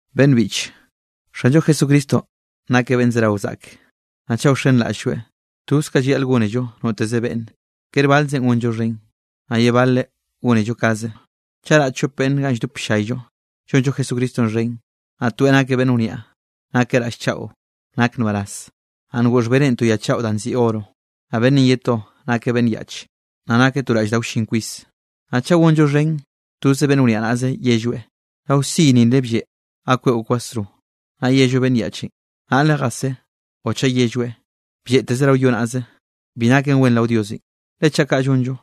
Beꞌnn biꞌche, Xanllo Jesucristonꞌ nakeꞌ beꞌnn zerawe zaꞌke, naꞌ chaꞌ wxenraꞌll-lloeꞌ, toz kanꞌ llayaꞌl gónello noteze beꞌnne, kere balzeꞌn gonllo xhen, naꞌ ye bale gónello kaze. Chaꞌ raꞌ chop beꞌnne ganꞌ lldop ll-llayllo llonllo Jesucristonꞌ xhen, naꞌ toeꞌ nakeꞌ beꞌnn wniaꞌ nakeꞌ raꞌll chaꞌo nak nbaraz, naꞌ ngoꞌ xhbeneꞌ to ya chaꞌo danꞌ nziꞌi oro, naꞌ beꞌnnenꞌ ye to nakeꞌ beꞌnn yaꞌch, naꞌ nakeꞌ to raꞌll da wllin kwis, naꞌ chaꞌ gonllo xhen toze beꞌnn wniaꞌ naꞌze yelloeꞌ: “Rao siy nile blleꞌ ga kweꞌo kwasro”, naꞌ yello beꞌnn yaꞌchenꞌ: “Naꞌle jasé”, o chaꞌ yelloeꞌ: “Blleꞌteze rao yo naꞌze”, bi naken wen rao Diosenꞌ, le chaꞌ kaꞌ llonllo,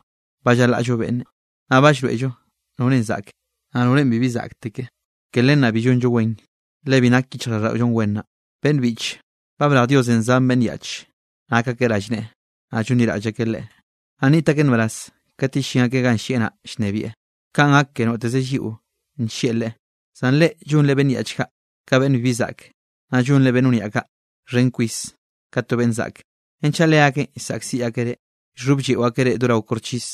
ba llalaꞌllo beꞌnne, naꞌ ba llroeꞌllo norenꞌ zaꞌke, naꞌ norenꞌ bibi zaꞌkteke. Ke len naꞌ bi llonllo wen, le bi nak yichjraꞌlldaꞌollo wen naꞌ. Beꞌnn biꞌche, ba brej Diosenꞌ zan beꞌnn yaꞌch, nak akeꞌ rallneꞌe, naꞌ llonliraꞌll akeꞌ Leꞌe. Naꞌ nniꞌt akeꞌ nbaraz kat yellín akeꞌ ganꞌ llieꞌ naꞌ llnebieꞌ, kanꞌ gak ke noteze lliꞌo nllieꞌ Leꞌe. Zan reꞌ llonre beꞌnn yaꞌch kaꞌ ka beꞌnn bibi zaꞌke. Naꞌ llonre beꞌnn wniaꞌ kaꞌ xhen kwis ka to beꞌnn zaꞌke. Renchaꞌ leakeꞌn llsaꞌkziꞌ akeꞌ reꞌ, llxhoblleꞌo akeꞌ reꞌ do rao koxchis.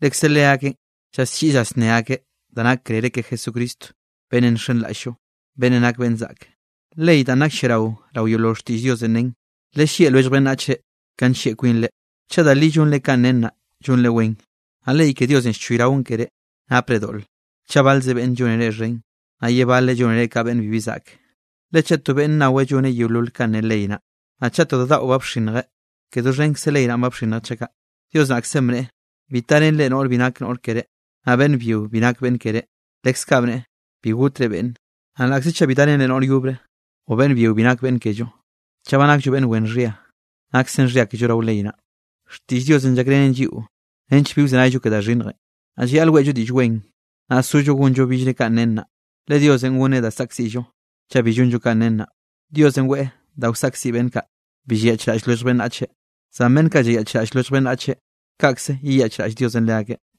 Lekze leakeꞌn llalliꞌi llasné akeꞌ da nak krere ke Jesucristo beꞌnnenꞌ nxenraꞌll-llo, beꞌnnenꞌ nak beꞌnn zaꞌk. Ley danꞌ nak lliarao rao yeolol xtiꞌll Diosenꞌ nen: “Lellieꞌ lwellj beꞌnnachre ka nllieꞌ kwinre.” Chaꞌ da li llonre kanꞌ nen naꞌ, llonre wen. Naꞌ ley ke Diosenꞌ llchoyraon keré, napre doꞌle chaꞌ balze beꞌnne llonre xhen, naꞌ ye baleꞌ llónere ka beꞌnn bibi zaꞌke. Le chaꞌ to beꞌnne naweꞌ lloneꞌ yeolol kanꞌ ne ley naꞌ, naꞌ chaꞌ to da daꞌo ba bxinnjeꞌ, ke doxhenkze ley naꞌn ba bxinnjeꞌ chaꞌ kaꞌ. Dios naꞌkzenꞌ bneꞌe: “Bi tarenre noꞌr bi nak noꞌr keré, naꞌ beꞌnn byio bi nak beꞌnn keré”, leskaꞌ bneꞌe: “Bi gotre beꞌnne”. Naꞌ laꞌkze chaꞌ bi darenllo noꞌr yobre, o beꞌnn byio bi nak beꞌnn kello, chaꞌ ba nakllo beꞌnn wen xhia, naksen xhia kello rao ley naꞌ. Xtiꞌll Diosenꞌ llakrenen lliꞌo nench bi wzenayllo ke da xhinnjenꞌ. Naꞌ llayaꞌl weꞌllo Diꞌll Wen, naꞌ sollo gonllo billre kanꞌ nen naꞌ, le Diosenꞌ gonneꞌ da saꞌkziꞌllo chaꞌ bi llonllo kanꞌ nen naꞌ. Diosenꞌ weꞌe da wsaꞌkziꞌ beꞌnn kaꞌ, bi llayaꞌchraꞌll lwellj beꞌnnache. Zan beꞌnn kaꞌ llayaꞌchraꞌll lwellj beꞌnnache, kaꞌkze yeyaꞌchraꞌll Diosenꞌ leakeꞌ.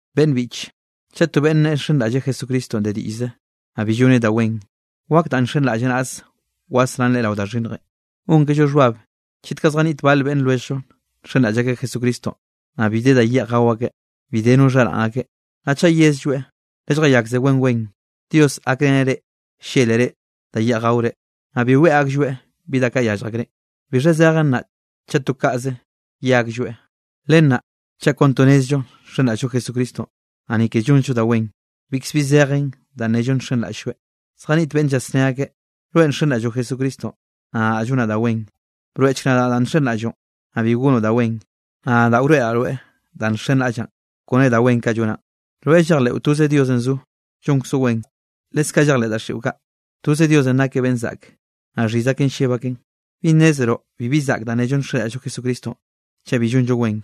Beꞌnn biꞌche, chaꞌ to beꞌnne nneꞌe nxenraꞌlleꞌ Jesucristonꞌ de diꞌllze, naꞌ bi lloneꞌ da wen, ¿wak danꞌ nxenraꞌlleꞌ naꞌze wasrán leꞌe rao da xhinnjenꞌ? Gonkello xhbab chet kaꞌ zjaniꞌt bal beꞌnn lwelljllo nxenraꞌll akeꞌ Jesucristonꞌ, naꞌ bi de da yeꞌj gao akeꞌ, bi de no xharaꞌn akeꞌ. Naꞌ chaꞌ yezlloeꞌ: “Lelljayakze wen wen, Dios gakreneꞌ reꞌ llélere da yeꞌj gaore”, naꞌ bi weꞌe aklloeꞌ bi da kaꞌ llyallj akreꞌ, ¿bixha zejen naꞌ chaꞌ to kaꞌze ye aklloeꞌ? Len naꞌ chaꞌ kon to nnezllo nxenraꞌll-llo Jesucristonꞌ, naꞌ ni ke llonzllo da wen, bikzbi zejen danꞌ nnello nxenraꞌll-lloeꞌ. Zjaniꞌt beꞌnne llasné akeꞌ: “Rweꞌ nxenraꞌlloꞌ Jesucristonꞌ, naꞌ nadaꞌ llonaꞌ da wen.” Broeꞌchk nadaꞌ danꞌ nxenraꞌlloꞌn, naꞌ bi gonoꞌ da wen, naꞌ nadaꞌ wroeꞌraꞌ rweꞌ danꞌ nxenraꞌllaꞌn kone da wen kaꞌ llonaꞌn. Rweꞌ llejleꞌo toze Diosenꞌ zo, llonkzoꞌ wen. Leskaꞌ llejleꞌ daxiꞌo kaꞌ, toze Diosenꞌ nakeꞌ beꞌnn zaꞌke, naꞌ xhiz aken lleb aken. ¿Bi nnezroꞌ bibi zaꞌk danꞌ nello nxenraꞌll-llo Jesucristonꞌ chaꞌ bi llonllo wen?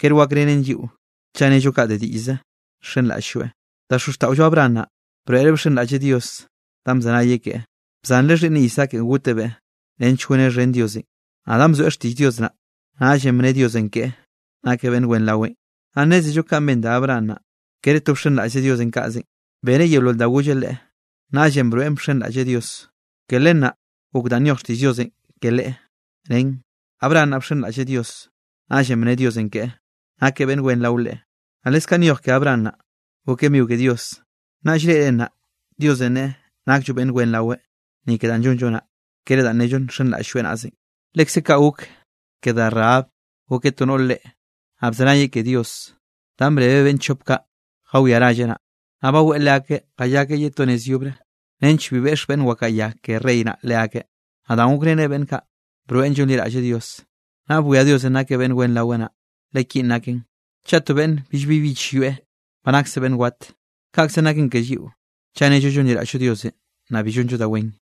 Kere wakrenen lliꞌo chaꞌ nnello kaꞌ de diꞌllze nxenraꞌll-lloeꞌ. Da xozxtaꞌollo Abraham naꞌ, broeꞌre bxenraꞌlleꞌ Dios danꞌ bzenayeꞌ keꞌe, bzanreꞌ xhiꞌnneꞌ Isaakenꞌ gotebeꞌ nench goneꞌ xhen Diosenꞌ. Naꞌ danꞌ bzoeꞌ xtiꞌll Dios naꞌ, naꞌllenꞌ bne Diosenꞌ keꞌe, nakeꞌ beꞌnn wen raweꞌ. Naꞌ nnézello kanꞌ ben da Abraham naꞌ, kere to bxenraꞌllzeꞌ Diosenꞌ kaꞌzenꞌ, beneꞌ yeolol da golleꞌ leꞌe. Naꞌllenꞌ broeꞌn bxenraꞌlleꞌ Dios. Ke len naꞌ gok danꞌ nyoj xtiꞌll Diosenꞌ ke leꞌe, nen: “Abraham naꞌ bxenraꞌlleꞌ Dios, naꞌllenꞌ bne Diosenꞌ keꞌe, nakeꞌ beꞌnn wen rao Leꞌe.” Naꞌ leskaꞌ nyoj ke Abraham naꞌ, gokeꞌ migo ke Dios. Naꞌ llreꞌre naꞌ, Diosenꞌ neꞌe nakllo beꞌnn wen raweꞌ, ni ke danꞌ llonllo naꞌ, kere danꞌ nello nxenraꞌll-lloeꞌ naꞌzenꞌ. Lekze kaꞌ gok ke da Rahab gokeꞌ to noꞌr reꞌe, naꞌ bzenayeꞌ ke Dios danꞌ brebeꞌ beꞌnn chop kaꞌ jawiá ralleꞌ naꞌ. Naꞌ baweꞌ leakeꞌ jayakeꞌ ye to nez yobre, nench bi jeꞌx beꞌnn wakaꞌa ya ke rey naꞌ leakeꞌ. Naꞌ danꞌ gokreneꞌ beꞌnn kaꞌ, broeꞌn llonliraꞌlleꞌ Dios. Naꞌ bwia Diosenꞌ nakeꞌ beꞌnn wen raweꞌ naꞌ. Le kinꞌ naken: Chaꞌ to beꞌnne billbi bich yoeꞌ, ba nakseꞌ beꞌnn wat. Kaꞌkzenꞌ naken ke lliꞌo, chaꞌ nello llonliraꞌll-llo Diosenꞌ, naꞌ bi llonllo da wen.